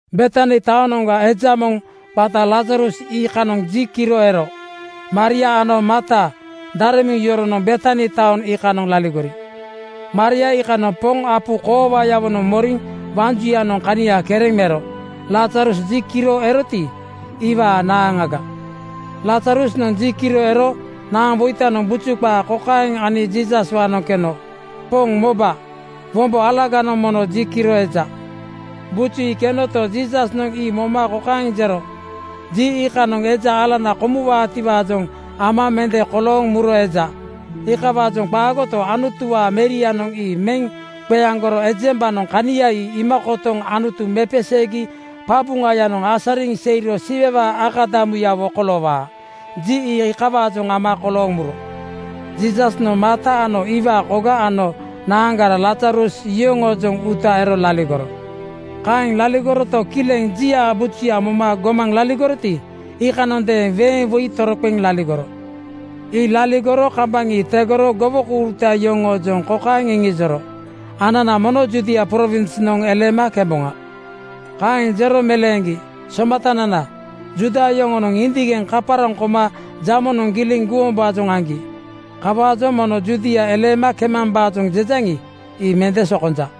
Betani taonoŋa eja moŋ qata Lazarus iikanoŋ ji kiro ero. Maria ano Marta daremuŋ yoronoŋ Betani taoŋ iikanoŋ laligori. Maria iikanoŋ Poŋ apu koowayawonoŋ moriŋ waŋ juyanoŋ kania kereŋ mero. Lazarus ji kiro eroti, ii iwaa naaŋaga. Lazarusnoŋ ji kiro ero naaŋwoitanoŋ buju qaa kokaeŋ ani Jiisaswaanoŋ keno, “Poŋ moba, wombo alaganoŋ mono ji kiro eja.” Buju ii kenoto, Jiisasnoŋ ii moma kokaeŋ jero, “Ji iikanoŋ eja alana komuwaatiwaajoŋ ama mende kolooŋ muro eja. Iikawaajoŋ qaagoto, Anutuwaa Merianoŋ ii meŋ qeaŋgoro ejembanoŋ kania ii iima kotoŋ Anutu mepeseegi qabuŋayanoŋ asariŋ seiro Siwewaa akadamuyawo koloowaa. Ji ii iikawaajoŋ ama kolooŋ muro.” Jiisasnoŋ Marta, iwaa koga ano naaŋgara Lazarus yoŋoojoŋ uuta ero laligoro. Kaeŋ laligoroto, kileŋ jiaa bujuya moma gomaŋ laligoroti, iikanondeeŋ weeŋ woi toroqeŋ laligoro. Ii laligoro kambaŋ ii tegoro gowokouruta yoŋoojoŋ kokaeŋ iŋijoro, “Anana mono Judia prowinsnoŋ eleema kemboŋa.” Kaeŋ jero meleeŋgi, “Somatanana, Juuda yoŋonoŋ indigeŋ kaparaŋ koma jamonoŋ giliŋ guwombaajoŋ aŋgi. Kawaajoŋ mombo Judia eleema kemambaajoŋ jejaŋi, ii mende sokonja.”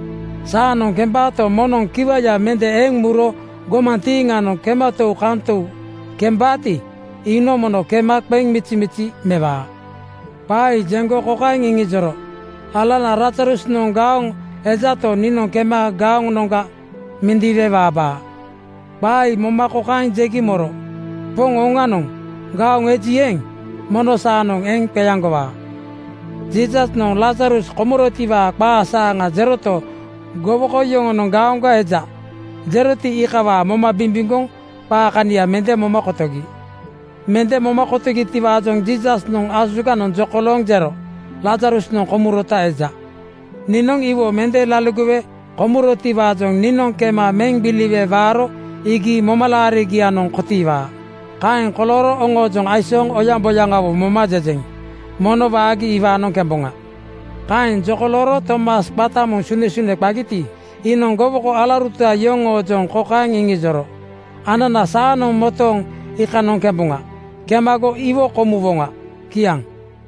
Saanoŋ kembaato, moŋnoŋ kiwaya mende eŋ muro gomantiiŋanoŋ kematou-kantou kembaati, iinoŋ mono kema qeŋ mizimizi mewaa.” Qaa ii jeŋgo kokaeŋ iŋijoro, “Alanana Lazarusnoŋ gaoŋ ejato, niinoŋ kema gaonoŋga mindiiwe waabaa.” Qaa ii moma kokaeŋ jegi moro, “Poŋ, oŋanoŋ gaoŋ eji eeŋ, mono saanoŋ eŋ qeaŋgowaa.” Jiisasnoŋ Lazarus komurotiwaa qaa saaŋa jeroto, gowoko yoŋonoŋ ‘Gaoŋga eja,’ jeroti, iikawaa moma bimbimgoŋ qaa kania mende moma kotogi. Mende moma kotogitiwaajoŋ Jiisasnoŋ asuganoŋ jokolooŋ jero, “Lazarusnoŋ komurota eja. Niinoŋ iwo mende laligowe komurotiwaajoŋ niinoŋ kema meŋ gbiliwe waaro iigi momalaariŋgianoŋ kotiiwaa. Kaeŋ kolooro oŋoojoŋ aisooŋ oyaŋboyaŋawo moma jejeŋ. Mono waagi iwaanoŋ kemboŋa.” Kaeŋ jokolooro Tomas qata moŋ Sunesune qagiti, iinoŋ gowoko alauruta yoŋoojoŋ kokaeŋ iŋijoro, “Anana saanoŋ motooŋ iikanoŋ kemboŋa. Kemago iwo komuwoŋa.” Kiaŋ.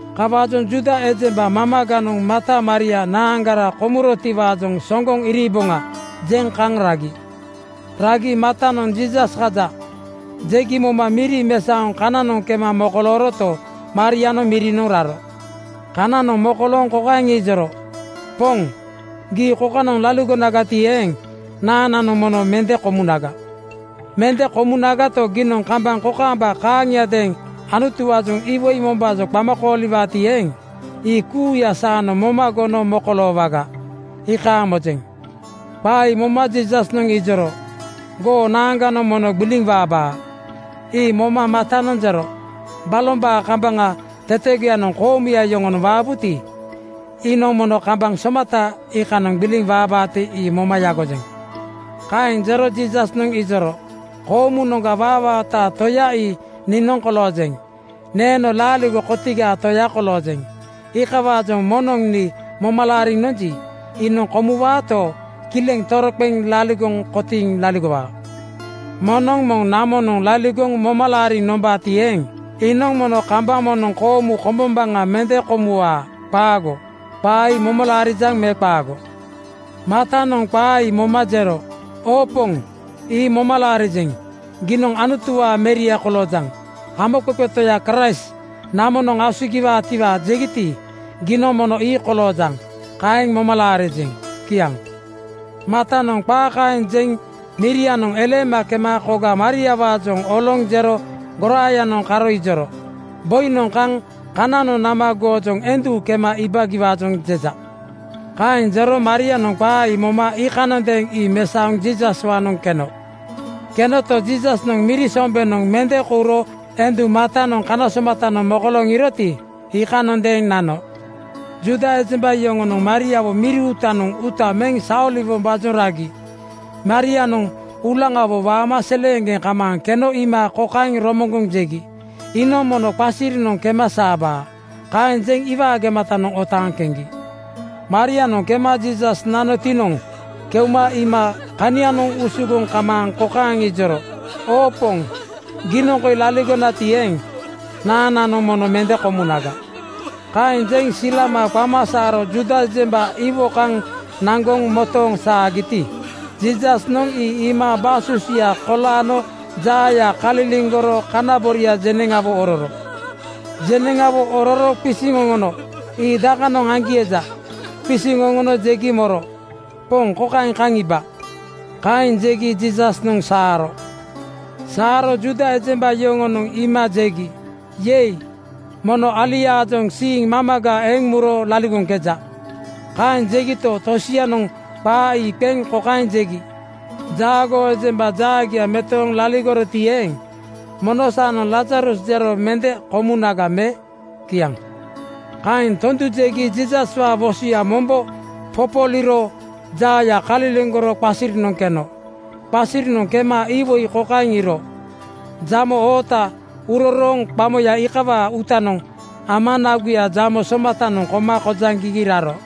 Kawaajoŋ Juuda ejemba mamaganoŋ Marta Maria naaŋgara komurotiwaajoŋ ‘Soŋgoŋ iriiboŋa,’ jeŋ kaŋ ragi. Ragi Martanoŋ “Jiisas kaja,” jegi moma miri mesaoŋ kananoŋ kema mokolooroto, Marianoŋ mirinoŋ raro. Kananoŋ mokolooŋ kokaeŋ ijoro, “Poŋ, gii kokanoŋ laligonagati eeŋ, naaŋnanoŋ mono mende komunaga. Mende komunagato, giinoŋ kambaŋ kokaamba kaaŋiadeeŋ Anutuwaajoŋ iwoi mombaajoŋ qama kooliwaati eeŋ, ii kuuya saanoŋ moma gono mokoloowaga, iikaaŋ mojeŋ.” Qaa ii moma Jiisasnoŋ ijoro, “Goo naaŋganoŋ mono gbiliŋ waabaa.” Ii moma Martanoŋ jero, “Balombaa kambaŋ tetegoyanoŋ koomuya yoŋonoŋ waabuti, iinoŋ mono kambaŋ somata iikanoŋ gbiliŋ waabaati, ii moma yagojeŋ.” Kaeŋ jero Jiisasnoŋ ijoro, “Koomunoŋga waawaataa Toya ii niinoŋ koloojeŋ. Neeno Laaligo kotigaa Toya koloojeŋ. Iikawaajoŋ moŋnoŋ nii moma laariŋ nonji, iinoŋ komuwaato, kileŋ toroqeŋ laligoŋ kotiiŋ laligowaa. Moŋnoŋ moŋ namonoŋ laligoŋ moma laariŋ nombaati eeŋ, iinoŋ mono kambaŋ moŋnoŋ koomu kom-bombaŋa mende komuwaa. Qaago. Qaa ii moma laarijaŋ me qaago?” Martanoŋ qaa ii moma jero, “Oo Poŋ, ii moma laarijeŋ. Giinoŋ Anutuwaa Meria koloojaŋ. Hamoqeqe Toya Kraist namonoŋ asugiwaatiwaa jegiti, giinoŋ mono ii koloojaŋ. Kaeŋ moma laarijeŋ.” Kiaŋ. Martanoŋ qaa kaeŋ jeŋ mirianoŋ eleema kema koga Mariawaajoŋ oloŋ jero goraayanoŋ karo ijoro, “Boinoŋ kaŋ kananoŋ nama goojoŋ endu kema iibagiwaajoŋ jeja.” Kaeŋ jero Marianoŋ qaa ii moma iikanondeeŋ ii mesaoŋ Jiisaswaanoŋ keno. Kenoto, Jiisasnoŋ miri sombenoŋ mende kouro endu Martanoŋ kana somatanoŋ mokolooŋ iiroti, iikanondeeŋ nano. Juuda ejemba yoŋonoŋ Mariawo miri uutanoŋ uuta meŋ saoliwombaajoŋ ragi Marianoŋ uulaŋawo waama seleeŋgeŋ kamaaŋ keno iima kokaeŋ romoŋgoŋ jegi, “Iinoŋ mono qasirinoŋ kema saabaa.” Kaeŋ jeŋ iwaa gematanoŋ otaaŋ keŋgi. Marianoŋ kema Jiisas nanotinoŋ keuma iima kanianoŋ usugoŋ kamaaŋ kokaeŋ ijoro, “Oo Poŋ, giinoŋ koi laligonagati eeŋ, naaŋnanoŋ mono mende komunaga.” Kaeŋ jeŋ silama qama saaro Juuda ejemba iwo kaŋ naŋgoŋ motooŋ saagiti, Jiisasnoŋ ii iima basusuya kolaano jaaya kaliliŋgoro kana boria jeneŋawo ororo. Jeneŋawo ororo qisiŋ oŋono, “Ii dakanoŋ aŋgi eja?” Qisiŋ oŋono jegi moro, “Poŋ, kokaeŋ kaŋ iiba!” Kaeŋ jegi Jiisasnoŋ saaro. Saaro Juuda ejemba yoŋonoŋ iima jegi, “Yei! Mono aliaajoŋ siiŋ mamaga eŋ muro laligoŋkeja’ Kaeŋ jegito, tosianoŋ qaa ii qeŋ kokaeŋ jegi, “Jaagoo ejemba jaagia metooŋ laligoroti eeŋ, mono saanoŋ Lazarus jero mende komunaga me?” Kiaŋ. Kaeŋ tondu jegi Jiisaswaa wosoya mombo popoliiro jaaya kaliliŋgoro qasirinoŋ keno. Qasirinoŋ kema iwoi kokaeŋ iiro: Jamo oota urorooŋ qamoya iikawaa uutanoŋ ama naguya jamo somatanoŋ koma kojaŋgigi raro.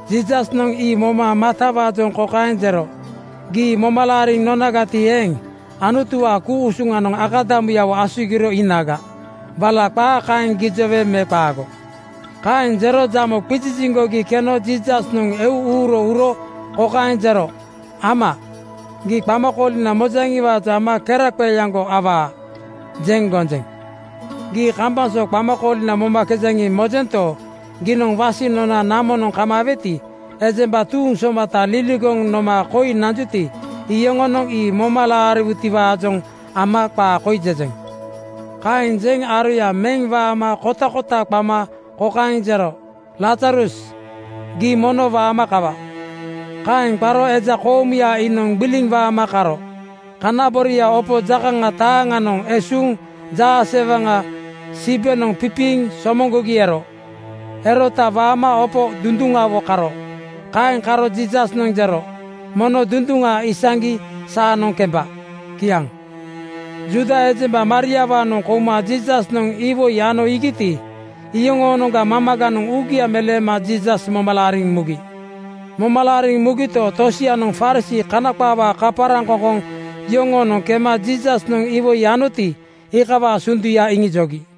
Jiisasnoŋ ii moma Martawaajoŋ kokaeŋ jero, “Gii moma laariŋ nonagati eeŋ, Anutuwaa ku-usuŋanoŋ akadamuyawo asugiro iinaga. Wala qaa kaeŋ gijowe me qaago?” Kaeŋ jero jamo qiziziŋgogi keno Jiisasnoŋ eu uuro uro kokaeŋ jero, “Ama, gii qamakoolina mojaŋiwaajoŋ ama ‘Keraqeeaŋgo awaa!’ jeŋ gonjeŋ. Gii kambaŋ so qamakoolina momakejaŋi, mojento, giinoŋ wasiŋ nona namonoŋ kamaaweti, ejemba tuuŋ somata liligoŋ noma koi nanjuti, iyoŋonoŋ ii moma moma laariwutiwaajoŋ ama qaa koi jejeŋ.” Kaeŋ jeŋ aroya meŋ waama kotakota qama kokaeŋ jero, “Lazarus, gii mono waama kawa!” Kaeŋ qaro eja koomuya iinoŋ gbiliŋ waama kaaro. Kana boria opo jakaŋa taaŋanoŋ esuuŋ jaasewaŋa sibenoŋ pipiiŋ somoŋgogi ero. Erota waama opo dunduŋawo karo. Kaeŋ karo Jiisasnoŋ jero, “Mono dunduŋa isaŋgi saanoŋ kemba.” Kiaŋ. Juuda ejemba Mariawaanoŋ kouma Jiisasnoŋ iwoi ano iigiti, iyoŋoonoŋga mamaganoŋ uugia meleema Jiisas moma laariŋ mugi. Moma laariŋ mugito, tosianoŋ Farisii (Kana qaawaa kaparaŋ-koŋkoŋ) yoŋoonoŋ kema Jiisasnoŋ iwoi anoti, iikawaa sunduya iŋijogi.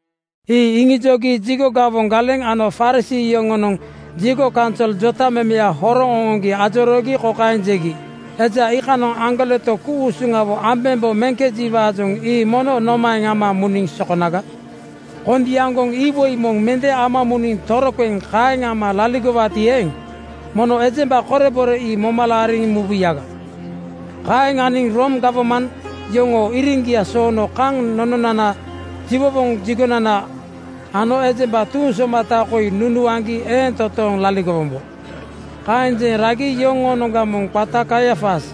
Ii iŋijogi jigo gawoŋ galeŋ ano Farisii yoŋonoŋ jigo kaunsol jotamemeya horoŋ oŋoŋgi ajoroogi kokaeŋ jegi, “Eja iikanoŋ aŋgoleto ku-usuŋawo ambembo meŋkejiwaajoŋ ii mono nomaeŋ ama muniŋ sokonaga? Kondiaŋgoŋ iwoi moŋ mende ama muniŋ toroqeŋ kaeŋ ama laligowaati eeŋ, mono ejemba korebore ii moma laariŋ mubuyaga. Kaeŋ aŋgi Rom gawman yoŋoo iriŋgia soono kaŋ nononana jiwowoŋ jigonana ano ejemba tuuŋ somata koi nunuaŋgi eeŋ totooŋ laligowombo.” Kaeŋ jeŋ ragi yoŋoonoŋga moŋ qata Kaiafas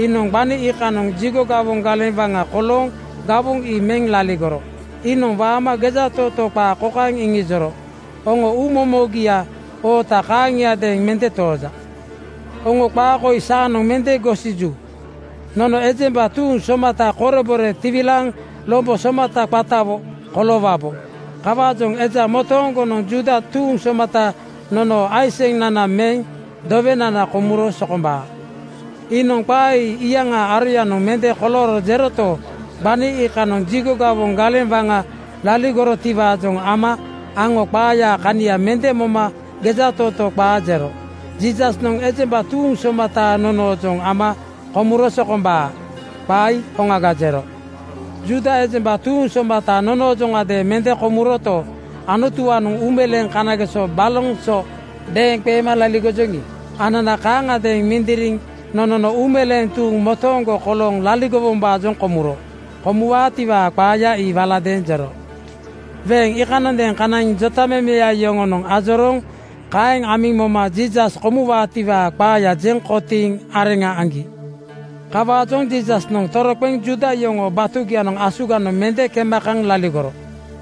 iinoŋ gbani iikanoŋ jigo gawoŋ galeŋ waŋa kolooŋ gawoŋ ii meŋ laligoro. Iinoŋ waama gejatootoo qaa kokaeŋ iŋijoro, “Oŋo uu momogiaa oota kaaŋiadeeŋ mende tooja. Oŋo qaa koi saanoŋ mende gosiju: Nono ejemba tuuŋ somata korebore tiwilaaniŋ lombo somata qatawo koloowabo. Kawaajoŋ eja motooŋgonoŋ Juuda tuuŋ somata nonoo aiseŋnana meŋ dowenana komuro sokombaa.” Iinoŋ qaa ii iyaŋaa aroyanoŋ mende kolooro jeroto, gbani iikanoŋ jigo gawoŋ galeŋ waŋa laligorotiwaajoŋ ama aŋo qaayaa kania mende moma gejatootoo qaa jero, “Jiisasnoŋ ejemba tuuŋ somata nonoojoŋ ama komuro sokombaa.” Qaa ii hoŋaga jero. Juuda ejemba tuuŋ somata nonoojoŋadeeŋ mende komuroto, Anutuwaanoŋ uumeleeŋ kanageso baloŋ so deeŋqeema laligojoŋi, anana kaaŋagadeeŋ mindiriŋ nonono uumeleeŋ tuuŋ motooŋgo kolooŋ laligowombaajoŋ komuro. Komuwaatiwaa qaaya ii waladeeŋ jero. Weeŋ iikanondeeŋ kanaiŋ jotamemeya yoŋonoŋ ajorooŋ kaeŋ amiŋ moma Jiisas komuwaatiwaa qaaya jeŋ kotiiŋ areŋa aŋgi. Kawaajoŋ Jiisasnoŋ toroqeŋ Juuda yoŋoo batugianoŋ asuganoŋ mende kema kaŋ laligoro.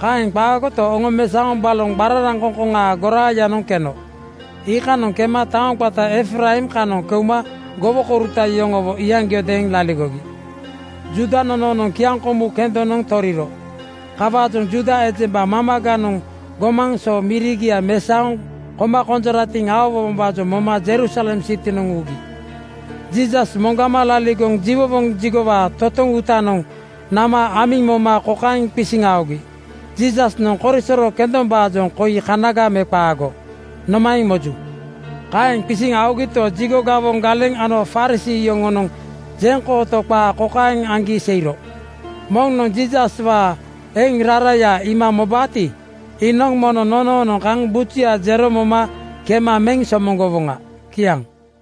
Kaeŋ qaagoto, oŋomesaoŋ baloŋ qararaŋkoŋkoŋaa goraayanoŋ keno. Iikanoŋ kema taoŋ qata Efraim kanoŋ keuma gowokouruta yoŋowo iyaŋgiodeeŋ laligogi. Juuda nonoonoŋ kiaŋkomu kendonoŋ toriro. Kawaajoŋ Juuda ejemba mamaganoŋ gomaŋ so mirigia mesaoŋ koma konjoratiŋ aowombaajoŋ moma Jerusalem sitinoŋ ugi. Jiisas moŋgama laligoŋ jiwowoŋ jigowaa totoŋ uutanoŋ nama amiŋ moma kokaeŋ qisiŋ aogi, “Jiisasnoŋ korisoro kendombaajoŋ koi kanaga me qaago? Nomaeŋ moju?” Kaeŋ qisiŋ aogito, jigo gawoŋ galeŋ ano Farisii yoŋonoŋ jeŋkooto qaa kokaeŋ aŋgi seiro, “Moŋnoŋ Jiisaswaa eŋ raraya iima mobaati, iinoŋ mono nonoonoŋ kaŋ bujuya jero moma kema meŋ somoŋgowoŋa.” Kiaŋ.